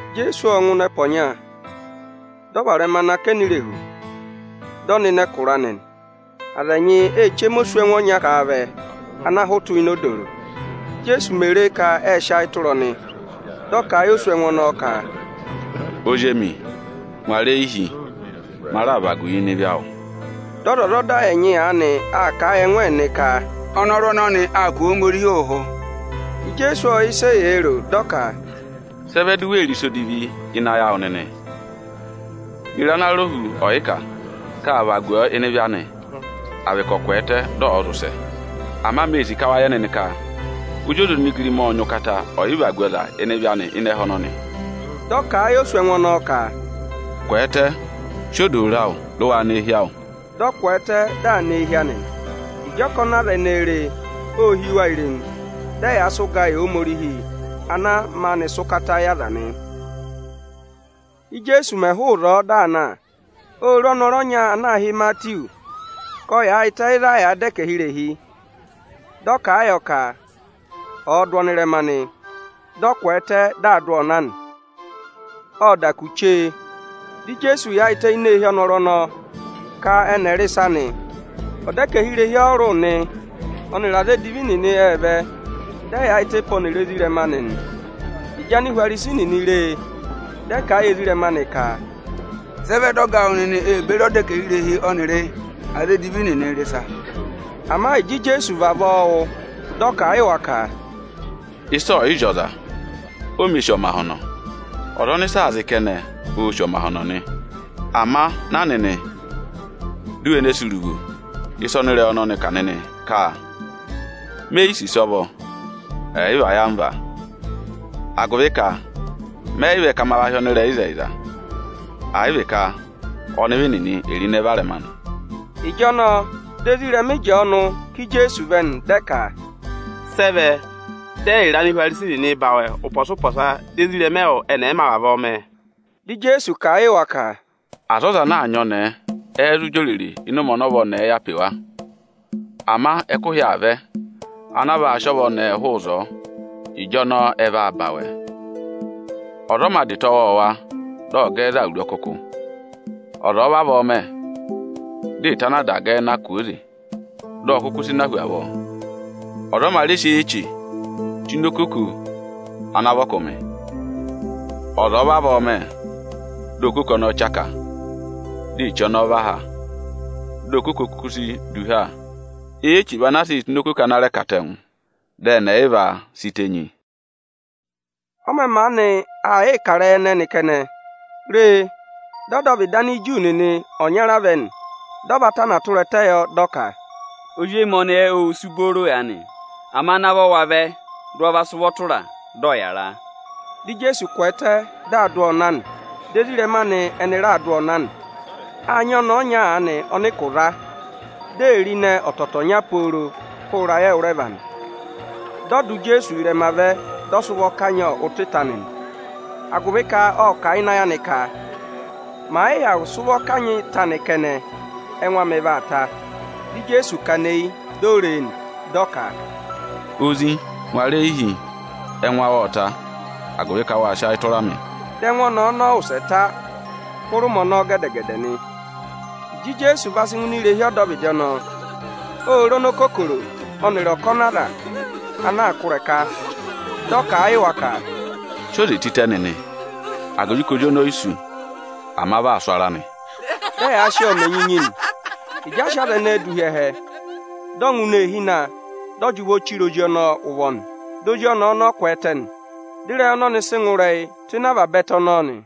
Ijeesu ộ ngụ ịnị ẹpa ọnya, dị ọ varẹma nọ akẹnẹ irehu, dị ọ nọ ịnị ẹkụra anị nị. Aza ẹnyị ê chema oswẹngụ ọnya ká a vẹ ana hụtụ ini odooro. Íjeesu mè re ka ệ sị ayị tụra ọnị, dị ọ kà a yị oswẹngụ ọnọọ ka, “Ozi emi, ngwara eyi hi, ma raa vagu wu ịnị ịvị awụ.” Dị ọzwọzọda ẹnyị aanị aa kà a yị ẹngụ ẹnịnị ka, “Ọnọrụ ọnọnị aa kụ̀ Ohomorihi ụhụ.” Ijeesu ộ yẹ ịsị eyee ro; dị ọ ka, “Sị ẹ vẹ di u wee ro ịsa odivi ịnị ayị awụ nịnị? Ye re ana rọ hu ọyịkà, ka â vagu ọ ịnị ịvị anị, à vị ka ọ̀ kwẹẹtẹ, dị ọ̀ọ zị ụsẹ? Ama mee sì ka wa yẹ nịnị ka Ozi ọza onigirima ộ nyị ụkata ọyị vagu ọza ịnị ịvị anị ịnị ẹhẹ ọnọnị.” Dị ọ kà a yị oswẹngụ ọnọọ ka, “Kwẹẹtẹ, sị odooro awụ, dị waa nọ eehi awụ!” Dị ọ kwẹẹtẹ, dị aa nọ eehi anị nị. Ịjị ọkọnị aza ẹnẹẹ re e, ô hí wa irenu, dị ẹyaa sị ụgaa yị Ohomorihi ana maanị sị ụkata yị aza nị. Íjeesu mẹ̀ hụụ ịzọọ, dị aa na, ô re ọnọrụ ọnya ana aā hị́ Imatiwu, ka ộ yaayịtẹ ịzị a yàā dọ ẹkẹhị irehi. Dị ọ kà a yọ ka ọ̀ọ dụ ọnị ịrẹma nị. Dị ọ kwẹẹtẹ, dị aa dụ ọọ na nị. Ộ da kù chee, dị Ijeesu yaayịtẹ ini eehi ọnọrụ ọnọọ ka ẹnị ẹ̀ rị ịsa nị. Ọdẹkẹhirehi ọrụrụ nịnị ọnịrị aza edivi nịnị ệ vẹ, dị ẹ yaayịtẹ pe ọnịrị ezirẹma anị nị. Ịjị Anihwarisi nịnị re e, dị ẹ kà a yị ezirẹma anị ka, “Sị ẹ vẹ dị ọga awụ nịnị ee beri ọdẹkẹhirehi ọnịrị aza edivi nịnị rị ịsa?” Ama ịjị Ijeesu vavọọ wụ́, dị ọ kà a yị wa ka, “Ịsa ọ̀ yị zị ọza, o mē sì ọmahọnọ. Ọza ọnị ịsa aa zị kẹnẹ, oō sì ọmahọnọ nị. Ama na nịnị, di u we ne sì uruvo ịsa ọnị ịrẹyị ọnọnị kà nịnị ka: ‘Me yi sì ịsọvọ, àyị vị ayamva.’ Agụvị ka mẹ yị vẹ ka ma hị́ ọnịrẹyịzẹyịza, àyị vị ka ọnịvị nịnị è ro ịnẹ varẹma nị.” Ịjọnọọ di ezirẹma Ịjọọnụ ká Ijeesu vẹ nị, dị ẹ ka, “Sị ẹ vẹ dị ẹyịrị Anihwarisi nịnị sị awẹ ụpọsa-ụpọsa, dị ezirẹma ẹwụ ẹnị ẹ̀ yị mā vavọọ mẹ?” Dị Ijeesu kà a yị wa ka, “Aza ọza anaa nyị ọnẹẹ ẹ́ẹ́ zụ jị òrèrè ịnị ụmẹ ọnị ọva ọnẹẹ yà pe wa? Ama ẹkụhị aa vẹ anaa vaa sị ọva ọnẹẹ hụụ ịzọọ, ịjọnọọ ẹ vaa ba awẹ. Ọza ọ mā dà ịta ọwọọwa, dị ọ gẹ ẹ za awuru ọkụkụ. Ọza ọ̀ọ vavọọ mẹ, dị ịta ana a dà gẹ ẹ na kwooze, dị ọ kụkụ sị na hu avọọ. Ọza ọ mā rẹ sị eyi-eche tụ́ ini okoko ana vị ọkụmị. Ọza ọ̀ọ vavọọ mẹ, dị okoko ọnọọ chaka, dị eche ọnọọ và ha, dị okoko kuku si du ha. Eyi-eche vị anaa sịị̄ tụ́ ini okoko ana rẹ katẹngụ, dị ẹnị ẹyịva si tenyi.” Ọ mẹ̀ maanị aa yịị kà ịrẹyị ẹnẹnị kẹnẹ, re, dị ọdọvịdị Aniju nịnị ọnyara vẹ nị, dị ọ va vaku ẹtẹ yọ, dị ọ ka, “Ozi emi ọnẹẹ ô wusu booro aanị; ama navọ wa vẹ dị ụ wa sị ụvọ tụra a, dị ọ̀ yàra.” Dị Ijeesu kwẹẹtẹ, dị aa dụ ọọ na nị. Dị ezirẹma anị ẹnị raa dụ ọọ na nị. Â nyị ọnẹẹ ọnya aanị ọnị ụkụ za, di e re ịnẹ ọtọtọọnya pooro hụrẹ ịrayị ẹwụrẹva nị. Dị ọ dụ Ijeesu ị́rẹma vẹ, dị ọ sị ụvọ kanyị ụtọ ịta anị nị. Agụvị ka ộ kà a ịnị ayị anị ka, màa yị hyakụ zụ sị ụvọ kanyị ịta anị kẹnẹ, ẹngụ amị vaa ta. Dị Ijeesu kana eyi, di o ree nị, dị ọ ka, “Ozi, ngụra eyi hi, ẹngụ awụ ộ ta, agụvị ka wâ sị ayị tụra mị.” Dị ẹngụ ọnẹẹ ọnọọ wụsẹ ta hụrẹ ụmẹ ọnọọ gẹdẹ-gẹdẹ nị. Ịjị Ijeesu va sị ngụ ini irehi ọdọvịdị ọnọọ, ô re onokokoro ọnịrị ọkọnị aza ana aa kụ́ ịrẹka. Dị ọ kà a yị wa ka, “Sị oze tịtẹ nịnị, agụvị ka ozi ọnọọ o yi sú, ama vị aa sụ̀ ara nị.” Dị ẹyaa sị ọọ mẹ enyinyi nị. Ịjị a sị aza ẹnẹẹ dụ hi ẹhẹ, dị ọ ngụ ini eehi na, dị ọ jị ụvọ chire ozi ọnọọ ụvọ nị, di ozi ọnẹẹ ọnọọ kwẹẹtẹ nị. Dị ịrẹyị ọnọnị sị ngụ ịrẹyị tụ́ ịnị avaba ẹtẹ ọnọọ nị.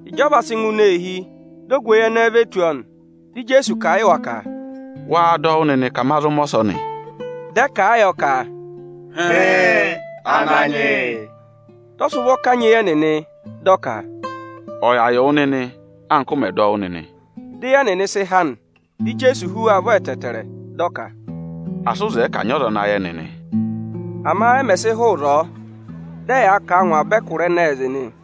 Ịjị ọ va sị ngụ ini eehi, di ogweyi ẹnẹẹ ve tù ọ nị. Dị Ijeesu kà a yị wa ka, “Wáá dọ wụ́ nịnị ka ma zụ mẹ ọsọnị?” Dị ẹ kà a yọ ka, “Hịịn, Ananyị yị.” Dị ọ sị ụvọ kanyị eyi ẹnịnị, dị ọ ka, “Ọ̀ yà yị wụ nịnị, anka ụ mẹ̀ dọ wụ́ nịnị!” Di eyi ẹnịnị sị há nị. Dị Ijeesu hú wa ụvọ ẹtẹẹtẹrẹ, dị ọ ka, “Asị ụ zẹẹ ka à nyị ọza ana yẹ nịnị o!” Ama ẹ mẹ̀ sị hụụ ịzọọ, dị ẹyaa kà a ngụ avaba ẹkụra ẹnẹẹ zị nị.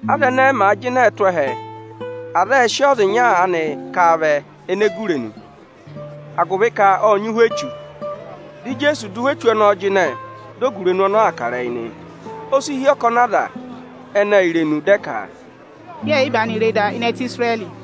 Aza ẹnẹẹ màa jịnẹẹ tụ́ ẹhẹ, aza ệ sị ọza ịnya aanị ká a vẹ ene gu irenu, agụvị ka ộ nyị ụhwẹ echu. Dị Ijeesu dụ ụhwẹ echu ọnọọ jịnẹ, di ogurenu ọnọọ aa kà ịrẹyị nị. O si hí ọkọnị aza ẹnẹẹ irenu, dị ẹ ka, “Yẹẹ̀ yị maanị re da ịnị ẹtẹ Isirẹrị.”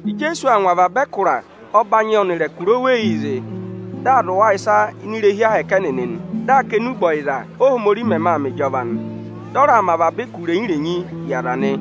Ijeesu aa ngụ avaba ẹkụra ọbanyị ọnịrị ẹkụra oweyii zị, dị aa zụ̀ wa ịsa ini irehi ahẹkẹ Aniju ẹnịnị nị, dị aa kà enube ọyịza, Óhomorihi mẹmẹ aa mẹ ịjọva nị. Dị ọ raa mẹ avaba ụkụ irenyi-renyii yị aza nị.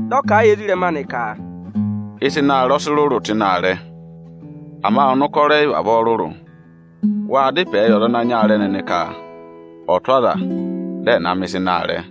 Dị ọ kà a yị ezirẹma anị ka, “Ịsa ịnị aarẹ ọ sị rụrụ tụ́ ịnị aarẹ, ama ọnụkọrọ ẹyị vavọọ rụrụ. Waa dá ịpẹẹ yị ọza ana nyị aarẹ nịnị ka ọ̀ tụ́ aza dị ẹ̀ na mẹ̀ ịsa ịnị aarẹ!”